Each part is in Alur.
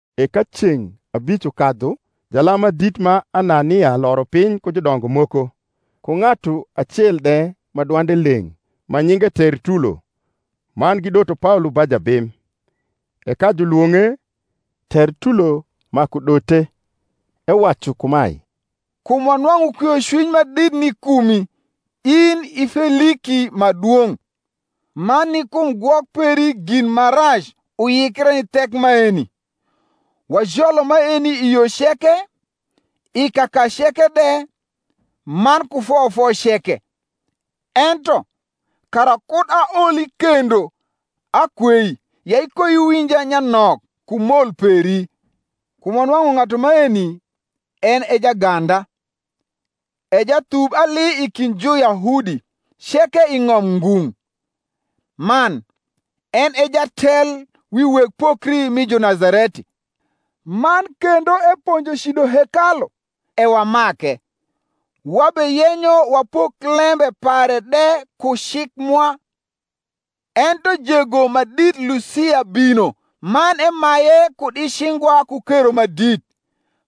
E ka ceng’ abic ukadhu jalam ma dit ma Anania loro piny ku judongo moko, ku ng’atu acel de ma dwande leng’, ma nyinge Tertulo; man gidoto Paolo ba jabim. E ka julwoug’e, Tertulo maku dote, ewacu kumae, Kum wanwang’u kwiocwiny ma dit ni kumi, in i Feliki ma dwong’, man ni kum gwok peri gin ma rac uyikre ni thek maeni, wajolo maeni i yo ceke, i kaka ceke de, man ku foyofoc ceke. Ento, kara kud aoli kendo, akwei ya ikoiwinja nyanok ku mol peri. Kum wanwang’u ng’atu maeni en e jaganda, e jathub ali i kind Juyahudi ceke i ng’om ngung’, man en e jatel wi weg pokri mi Junazareti: man kendo eponjo cido hekalu: e wamake: wabeyenyo wapok lembe pare de ku cik mwa. Ento jego ma dit Lusia bino, man emaye kud i cingwa ku kero ma dit,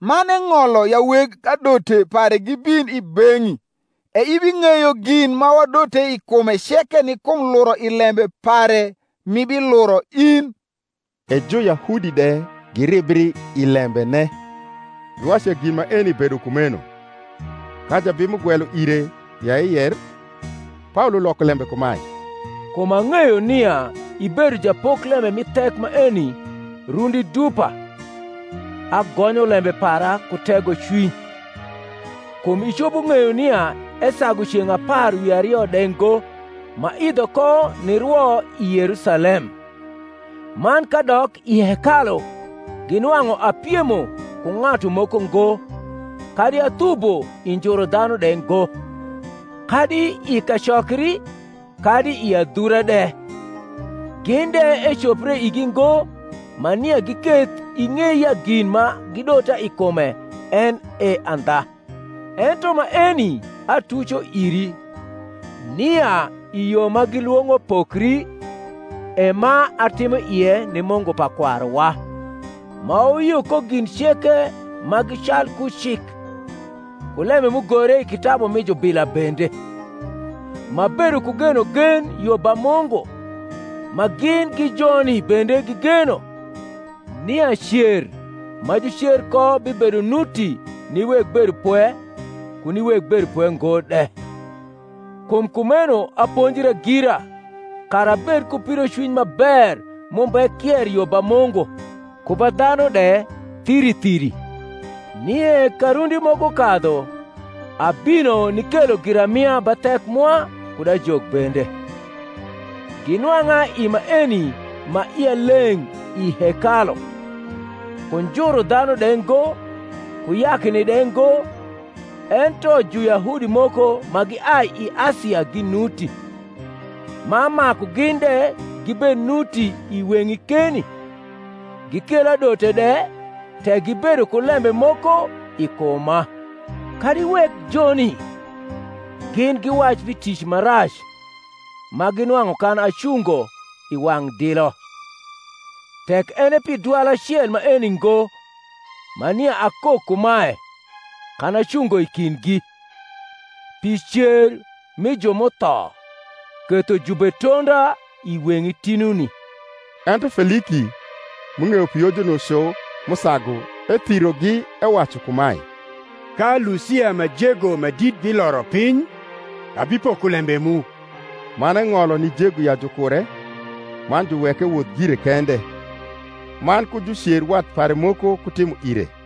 man eng’olo ya weg adote pare gibin i beng’i e ibing’eyo gin ma wadote i kume ceke ni kum luro i lembe pare m’ibiluro in. E Juyahudi de giribri i lembene, giwacu ya gin maeni bedo kumeno. Ka jabim ugwelo ire ya eycr, Paolo loko lembe kumae, Kum ang’eyo nia ibedo japoklembe mi thek maeni rundi dupa, agonyo lembe para ku tegocwiny: kum icopo ng’eyo nia esagu ceng’ apar wi ario de ngo m’aidho ko nirwo i Yerusalem: man kadok i hekalu ginwang’u apiemo ku ng’atu moko ngo kadi athubo i njuru dhanu de ngo, kadi i kacokri, kadi i adhura de. Gin de ecopre igi ngo ma nia giketh ing’ei ya gin ma gidota i kume en e andha. Ento maeni atuco iri, nia i Yo ma gilwong’o pokri, e ma atimo ie ni Mungu pa kwaruwa, ma wayio ko gin ceke ma gi calku cik, ku lembe m’ugore i kitabu mi jubila bende; m’abedo ku genogen yo ba Mungu, ma gin gi joni bende gigeno, nia cer ma jucer ko bibedo nuti ni weg bedopwe ku ni weg bedopwe ngo de. Kum kumeno aponjra gira kara abed ku pidocwiny ma ber m’umbe kier yo ba Mungu ku ba dhanu de thiri thiri. Nie ka rundi moko kadhu abino nikelo giramia ba thek mwa, kud ajok bende: ginwang’a i maeni ma ia leng’ i hekalu, ku njuru dhanu de ngo, ku yakni de ngo: ento Juyahudi moko ma giai i Asia ginuti, ma maku gin de gibed nuti i weng’i keni, gikel adote de, tek gibedo ku lembe moko i kuma. Kadi wek joni gin giwac pi tic ma rac ma ginwang’u kan acungo i wang’ dilo, tek en e pi dwal acel maeni ngo, ma nia akok kumae kan acungo i kindgi, Pi cer mi ju m’utho ketho jubetonda i weng’i tinuni. Ento Feliki, m’ung’eyo pi Yojuno cu m’usagu, ethirogi, ewacu kumae, Ka Lusia ma jego ma dit biloro piny, abipoko lembe mu. Man eng’olo ni jego ya jukure, man juweke ewoth gire kende; man ku jucer wat pare moko kutimo ire.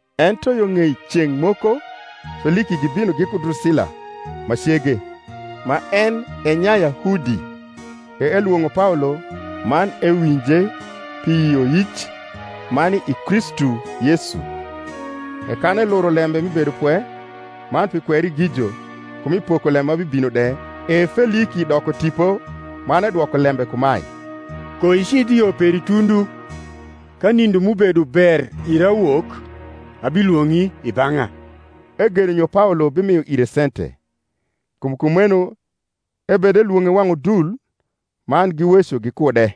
Ento yo ng’ei ceng’ moko, Feliki gibino giku Drusila, ma cege, ma en e Nyayahudi, e elwong’o Paolo, man ewinje pi yioyic ma ni i Kristu Yesu. E kan eluro lembe mi bedopwe, man pi kwerigijo, ku mi pokolembe ma bibino de, e Feliki doko tipo, man edwoko lembe kumae, Koicidh i yo peri tundu; ka nindo m’ubedo ber ira wok, abilwong’i i bang’a. Egeno nyo Paolo bimio ire sente: kum kumeno ebedelwong’e wang’ udul, man giweco gikude.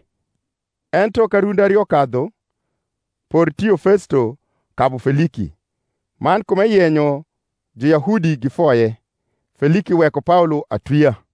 Ento ka rundi ario kadhu, Portio Festo kabu Feliki; man kum eyenyo Juyahudi gifoye, Feliki weko Paolo atwia.